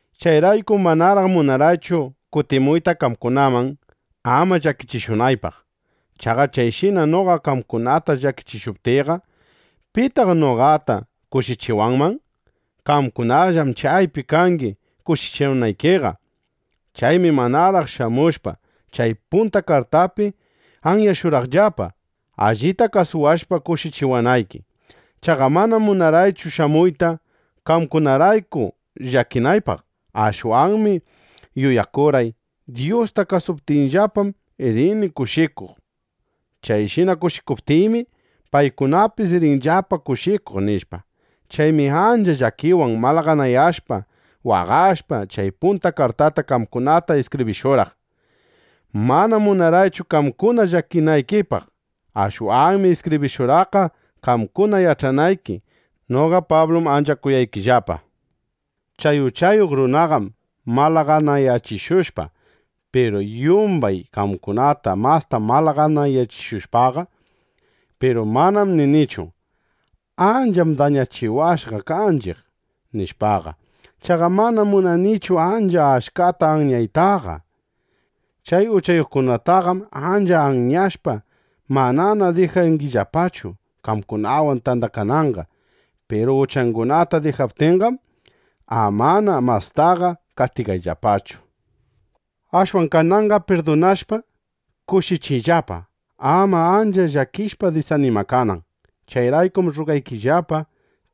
Chayraykum manaraq munarqaychu kutimuyta qamkunaman, ama llakichishunaypaq. Chaqa chayshina noqa qamkunata llakichishuptiyqa, ¿pitaq noqataqa kushichiwanman? Qamkunallam chaypi kangi, kushichiwanaykiqa. Chaymi manaraq shamushpa, chay punta kartaypi anyashurqaqllapa, allita kawsashpa kushichiwanayki. Chaqa manam munarqaychu shamuyta, qamkunarayku llakinaypaq. Ashwanmi yuyakurqay: Dyusta kasuptinllapam, rini kushikuq. Chayshina kushikuptiymi, paykunapis rinllapa kushikuq, nishpa. Chaymi ancha llakiwan malaganayashpa, waqashpa, chay punta kartata qamkunata iskibrishurqaq. Manam munarqaychu qamkuna llakinaykipaq. Ashwanmi iskibrishurqaqqa, qamkuna yach'anayki: Pablum ancha kuyawanchiqllapa, nishpa. Chay uchayuq runaqam malaganayachiwashqa. Piru yumbay qamkunata masta malaganayachishushqaqa. Piru manam ninichu: “Ancham dañachiwashqa kanchiq”, nishpaqa. Chaqa manam munanichu ancha achkata anyaytaqa. Chay uchayuqtaqam ancha anyashpa, manana dijangillapachu qamkunawan tandakananqa. Piru uchangunata dijaptinqam, amana mastaqa kastigayllapachu. Ashwan kananqa pirdunashpa, kushichiyllapa, ama ancha llakishpa disanimakanan. Chayraykum rrugaykillapa,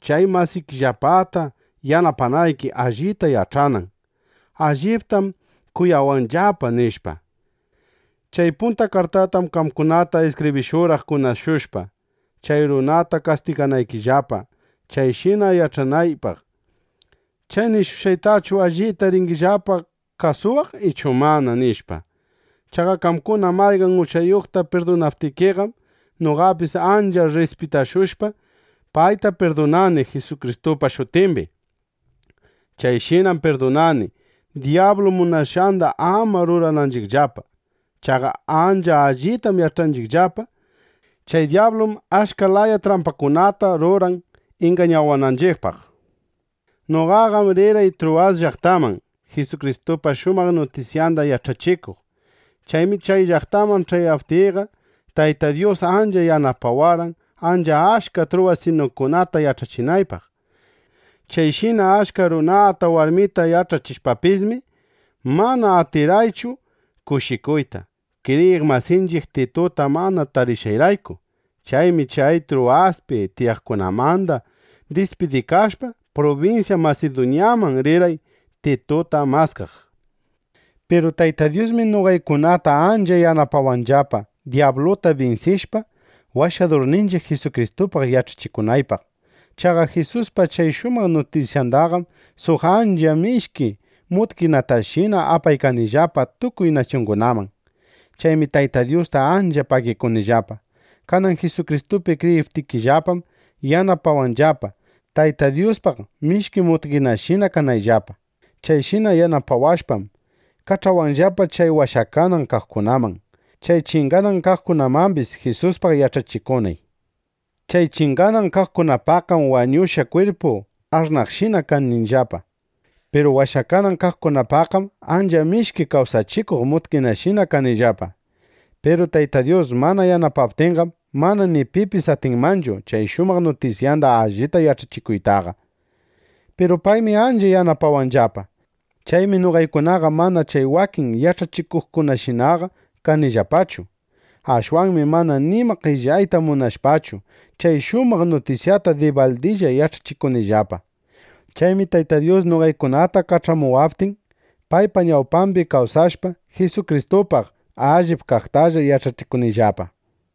chay masaykillapata yanapanayki, allita yach'anan: Alliptam kuyawanllapa, nishpa. Chay punta kartatam qamkunata iskibrishurqaq kunashushpa, chay runata kastiganaykillapa, chayshina yach'anaypaq: ¿Chay nishqaytachu allita rinllapa kasuwaq ichu mana? nishpa. Chaqa qamkuna mayqan uchayuqta pirdunaptikiqam, noqapis ancha rrispitashushpa, payta pirdunani Jisukristupa shutimbi. Chayshinam pirdunani, dyablu munashqanda ama rurananchiqllapa. Chaqa ancha allitam yach'anchiqllapa: Chay dyablum achka laya trampakunata ruran ingañawananchiq, nishpa. Noqaqam rirqay Truwas llaqtaman, Jisukristupa shumaq nutisyanda yach'achikuq. Chaymi chay llaqtaman ch'ayaptiyqa, Tayta Dyus ancha yanapawarqan, ancha achka truwasinukunata yach'achinaypaq. Chayshina achka runata, warmita yach'achishpapismi, mana atirqaychu kushikuyta, kriyiq masinchiq Tituta mana tarishqayrayku. Chaymi chay Truwaspi tiyaqkunamanda dispidikashpa, prubinsya Masiduñaman rirqay, Tituta maskaq. Piru Tayta Dyusmi noqaykunata ancha yanapawanllapa, dyabluta binsishpa, Washadurninchiq Jisukristupaq yach'achikunaypaq. Chaqa Jisuspa chay shumaq nutisyandaqam suq ancha mishki mutkinatashina apaykanillapa tukuy nasyungunaman. Chaymi Tayta Dyusta ancha pagikunillapa. Kanan Jisukristupi kriyiptiyllapam yanapawanllapa, Tayta Dyuspaq mishki mutkinashina kanayllapa. Chayshina yanapawashpam, kach'awanllapa chay washakanan kaqkunaman, chay chinganan kaqkunamambis, Jisuspaq yach'achikunay. Chay chinganan kaqkunapaqqam wañushqa kwirpu ash'naqshina kanillapa. Piru washakanan kaqkunapaqqam ancha mishki kawsachikuq mutkinashina kanillapa. Piru Tayta Dyus mana yanapaptinqam, mana ni pipis atinmanchu chay shumaq nutisyanda allita yach'achikuytaqa. (Piru paymi ancha yanapawanllapa.) Chaymi noqaykunaqa mana chay wakin yach'achikuqkunashinaqa kanillapachu. Ashwanmi mana nima qellayta munashpachu, chay shumaq nutisyata dibaldilla yach'achikunillapa. Chaymi Tayta Dyus noqaykunata kach'amuwaptin, paypa ñawpambi kawsashpa, Jisukristupaq allip kaqtalla yach'achikunillapa.